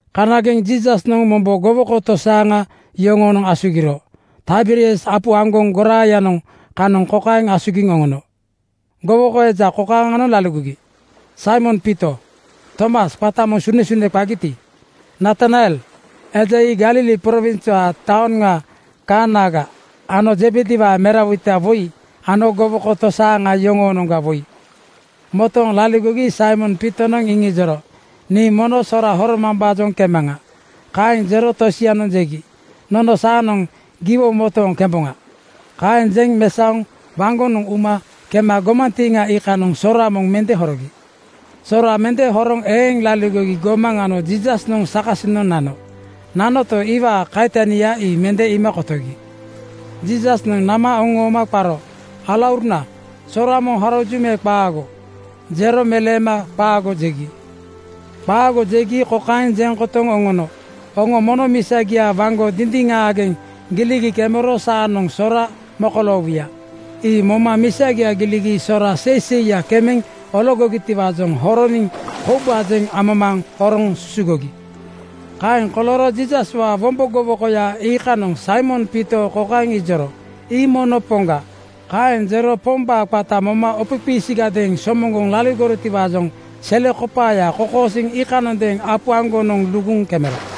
Kanageŋ Jiisasnoŋ mombo gowoko tosaaŋa yoŋoonoŋ asugiro. Taiberias apu aŋgoŋ goraayanoŋ kanoŋ kokaeŋ asugiŋ oŋono: Gowoko eja kokaaŋanoŋ motooŋ laligogi: Saimon Piito, Tomas qata moŋ Sunesune (Didimus) qagiti, Natanael eja ii Galili prowinswaa taoŋa Kaanaga ano Zebediwaa merawoita woi ano gowoko tosaaŋa yoŋoonoŋga woi. Motooŋ laligogi Saimon Piitonoŋ iŋijoro, “Nii mono sora horomambaajoŋ kemaŋa.” Kaeŋ jero tosianoŋ jegi, “Nono saanoŋ giwo motooŋ kemboŋa.” Kaeŋ jeŋ mesaoŋ waŋgonoŋ uma kema gomantiiŋa iikanoŋ sora moŋ mende horogi. Sora mende horoŋ eeŋ laligogi gomaŋ ano Jiisasnoŋ sakasinoŋ nano. Nanoto, iwaa kaitania ii mende iima kotogi. Jiisasnoŋ nama oŋooma qaro, “Alauruna, sora moŋ horoju me qaago?” Jero meleema “Qaago!” jegi. “Qaago!” jegi kokaeŋ jeŋ kotoŋ oŋono, “Oŋo mono misagia waŋgo dindiŋaageŋ giligi kemero saanoŋ sora mokoloowuya.” Ii moma misagia giligi sora seiseiya kemeŋ ologogitiwaajoŋ horoniŋ koubajeŋ amamaaŋ horoŋ susugogi. Kaeŋ kolooro Jiisaswaa wombo gowokoya iikanoŋ Saimon Piito kokaeŋ ijoro, “Ii mono Poŋga!” Kaeŋ jero Pombaa qata moma opoqiisiagadeeŋ somoŋgoŋ laligorotiwaajoŋ selekopaaya kokosiiŋ iikanondeeŋ apu aŋgonoŋ luguŋ kemero.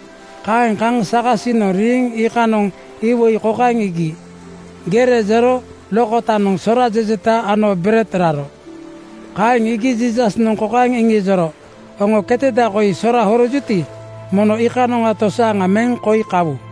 Kaeŋ kaŋ sakasinoŋ riiŋ iikanoŋ iwoi kokaeŋ iigi: Gere jero lokotanoŋ sora jejeta ano bered raro. Ii iigi Jiisasnoŋ kokaeŋ iŋijoro, “Oŋo keteda koi sora horojuti, mono iikanoŋa tosaaŋa meŋ koi kawu.”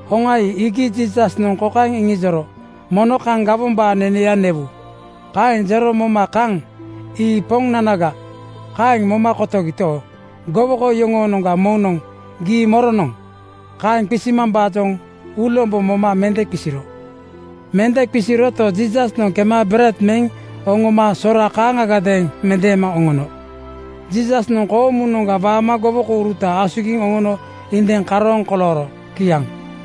Hoŋa ii iigi Jiisasnoŋ kokaeŋ iŋijoro, “Mono kaŋ gomaambawaa neneya newu.” Kaeŋ jero moma kaŋ “Ii Poŋnanaga,” kaeŋ moma kotogito, gowoko yoŋoonoŋga moŋnoŋ “Gii moronoŋ?” kaeŋ qisimambaajoŋ uulombo moma mende qisiro. Mende qisiroto, Jiisasnoŋ kema bered meŋ oŋoma sora kaaŋagadeeŋ mendeema oŋono. Jiisasnoŋ koomunoŋga waama gowokouruta asugiŋ oŋono indiŋ karooŋ kolooro. Kiaŋ.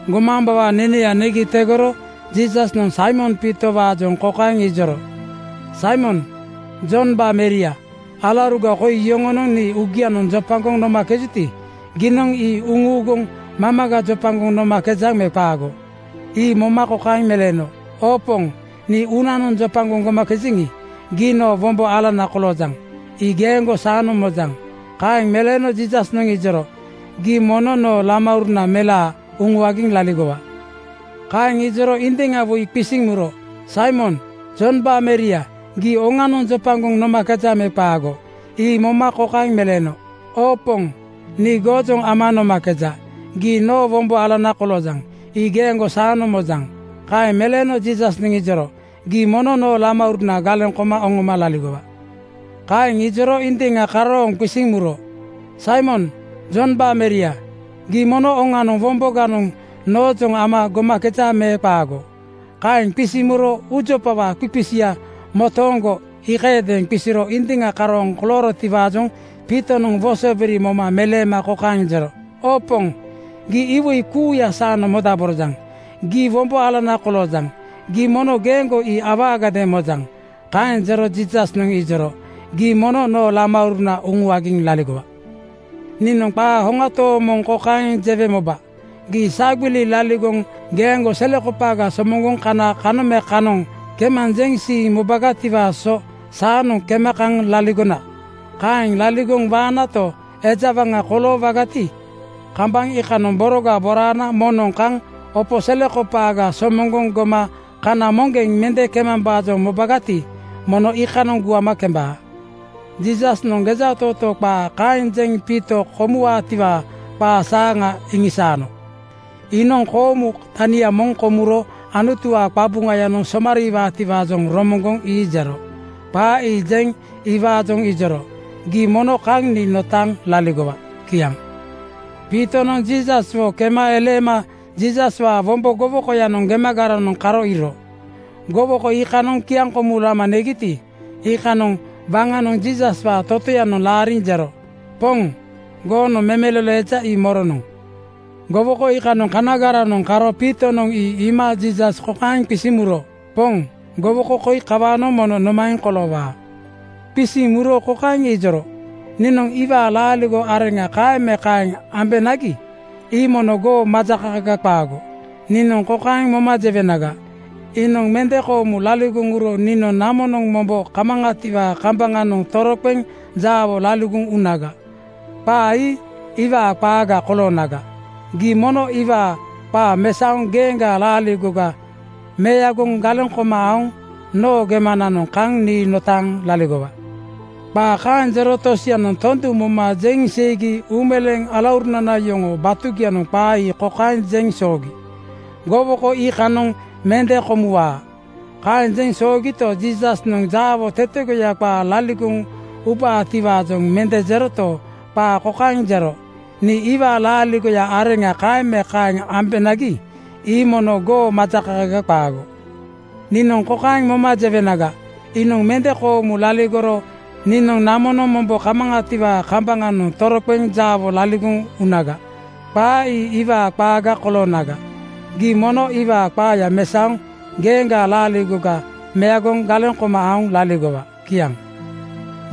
Gomaambawaa neneya negi tegoro Jiisasnoŋ Saimon Piito-waajoŋ kokaeŋ ijoro, “Saimon Jombaa meria, alauruga koi yoŋonoŋ nii uugianoŋ jopagoŋ nomakejuti, giinoŋ ii uŋuuguŋ mamaga jopagoŋ nomakejaŋ me qaago?” Ii moma kokaeŋ meleeno, “Oo Poŋ, nii uunanoŋ jopagoŋ gomakejeŋ. Gii noo wombo alana koloojaŋ. Ii geeŋgo saanoŋ mojaŋ.” Kaeŋ meleeno Jiisasnoŋ ijoro, “Gii mono noo lamauruna melaa uŋuagiŋ laligowa.” Kaeŋ ijoro indiŋa woi qisiŋ muro, “Saimon Jombaa meria, gii oŋanoŋ jopagoŋ nomakejaŋ me qaago?” Ii moma kokaeŋ meleeno, “Oo Poŋ, nii goojoŋ ama nomakeja. Gii noo wombo alana koloojaŋ. Ii geeŋgo saanoŋ mojaŋ.” Kaeŋ meleeno Jiisasnoŋ ijoro, “Gii mono noo lamauruna galeŋ koma oŋoma laligowa.” Kaeŋ ijoro indiŋa karooŋ qisiŋ muro, “Saimon Jombaa meria, gii mono oŋanoŋ womboganoŋ noojoŋ ama gomakeja me qaago?” Kaeŋ qisiŋ muro uujopawaa qiqisia motooŋgo iikayadeeŋ qisiro indiŋa karooŋ koloorotiwaajoŋ Piitonoŋ wosobiri moma meleema kokaeŋ jero, “Oo Poŋ, gii iwoi kuuya saanoŋ modaborojaŋ. Gii wombo alana koloojaŋ. Giinoŋ mono geeŋgo ii awaagadeeŋ mojaŋ.” Kaeŋ jero Jiisasnoŋ ijoro, “Gii mono noo lamauruna uŋuagiŋ laligowa. “Niinoŋ qaa hoŋa tooŋ moŋ kokaeŋ jewe moba: Gii sagbili laligoŋ geeŋgo selekopaaga somoŋgoŋ kana kanoŋ me kanoŋ kemanjeŋ siiŋ mobagatiwaa so saanoŋ kema kaŋ laligona. Kaeŋ laligoŋ waanato, eja waŋa koloowagati, kambaŋ iikanoŋ boroga boraana moŋnoŋ kaŋ opo selekopaaga somoŋgoŋ goma kana moŋgeŋ mende kemambaajoŋ mobagati, mono iikanoŋ guama kembaa.” Jiisasnoŋ gejatootoo qaa kaeŋ jeŋ Piito komuwaatiwaa qaa saaŋa iŋisaano. Iinoŋ koomu tania moŋ komuro Anutuwaa qabuŋaya somariiwaatiwaajoŋ romoŋgoŋ ii jero. Qaa ii jeŋ iwaajoŋ ijoro, “Gii mono kaŋ nii notaaŋ laligowa!” Kiaŋ. Piitonoŋ Jiisaswo kema eleema Jiisaswaa wombo gowokoyanoŋ gemagaranoŋ karo iiro. Gowoko iikanoŋ kiaŋkomu lama negiti, iikanoŋ waŋanoŋ Jiisaswaa totoyanoŋ laariŋ jero, ‘Poŋ, goonoŋ memelolo eja ii moronoŋ?’ Gowoko iikanoŋ kanagaranoŋ karo Piitonoŋ ii iima Jiisas kokaeŋ qisiŋ muro, “Poŋ, gowoko koi kawaanoŋ mono nomaeŋ koloowaa?” Qisiŋ muro kokaeŋ ijoro, “Niinoŋ iwaa laaligo areŋa kaeŋ me kaeŋ ambenagi, ii mono goo majakakaga qaago. Niinoŋ kokaeŋ moma jewenaga, ‘Iinoŋ mende koomu laligoŋ uro niinoŋ namonoŋ mombo kamaŋatiwaa kambaŋanoŋ toroqeŋ jaawo laligoŋ unaga,’ qaa ii iwaa qaaga koloonaga. Gii mono iwaa qaa mesaoŋ geeŋgaa laaligoga meagoŋ galeŋ koma aoŋ noo gemananoŋ kaŋ nii notaaŋ laligowa.” Qaa kaeŋ jero tosianoŋ tondu moma jeŋ seigi uumeleeŋ alaurunana yoŋoo batugianoŋ qaa ii kokaeŋ jeŋ soogi, “Gowoko iikanoŋ mende komuwaa.” Kaeŋ jeŋ soogito, Jiisasnoŋ jaawo tetegoya qaa laligoŋ ubaatiwaajoŋ mende jeroto, qaa kokaeŋ jero, “Niinoŋ iwaa laaligo areŋa kaeŋ me kaeŋ ambenagi, ii mono goo majakakaga qaago. Niinoŋ kokaeŋ moma jewenaga, ‘Iinoŋ mende koomu laligoro niinoŋ namonoŋ mombo kamaŋatiwaa kamba-ŋanoŋ toroqeŋ jaawo laligoŋ unaga,’ qaa ii iwaa qaaga koloonaga. Gii mono iwaa qaaya mesaoŋ geeŋgaa laaligoga meagoŋ galeŋ koma aoŋ laligowa.” Kiaŋ.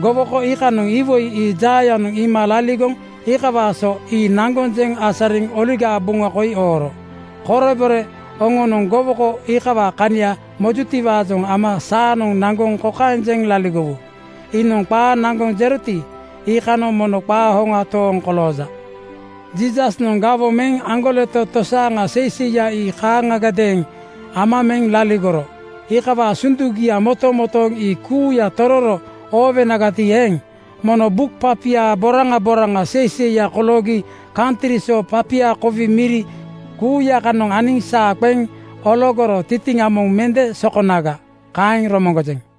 Gowoko iikanoŋ iwoi ii jaayanoŋ iima laligoŋ iikawaa so ii naŋgoŋ jeŋ asariŋ Oligaa Buŋa koi ooro. Korebore oŋonoŋ gowoko iikawaa kania mojutiwaajoŋ ama saanoŋ naŋgoŋ kokaeŋ jeŋ laligowu, “Iinoŋ qaa naŋgoŋ jeroti, iikanoŋ mono qaa hoŋa tooŋ kolooja.” Jiisasnoŋ gawoŋ meŋ aŋgoleto tosaaŋa seiseiya ii kaaŋa-gadeeŋ ama meŋ laligoro. Iikawaa sundugia motomotooŋ ii kuuya tororo oowonagati eeŋ, mono buk papia boraŋa boraŋa seiseiya koloogi kantri so papia kowi miri (laibreri) kuuya kanoŋ aniŋ saa qeŋ ologoro tintiŋa moŋ mende sokonaga. Kaeŋ romoŋgojeŋ.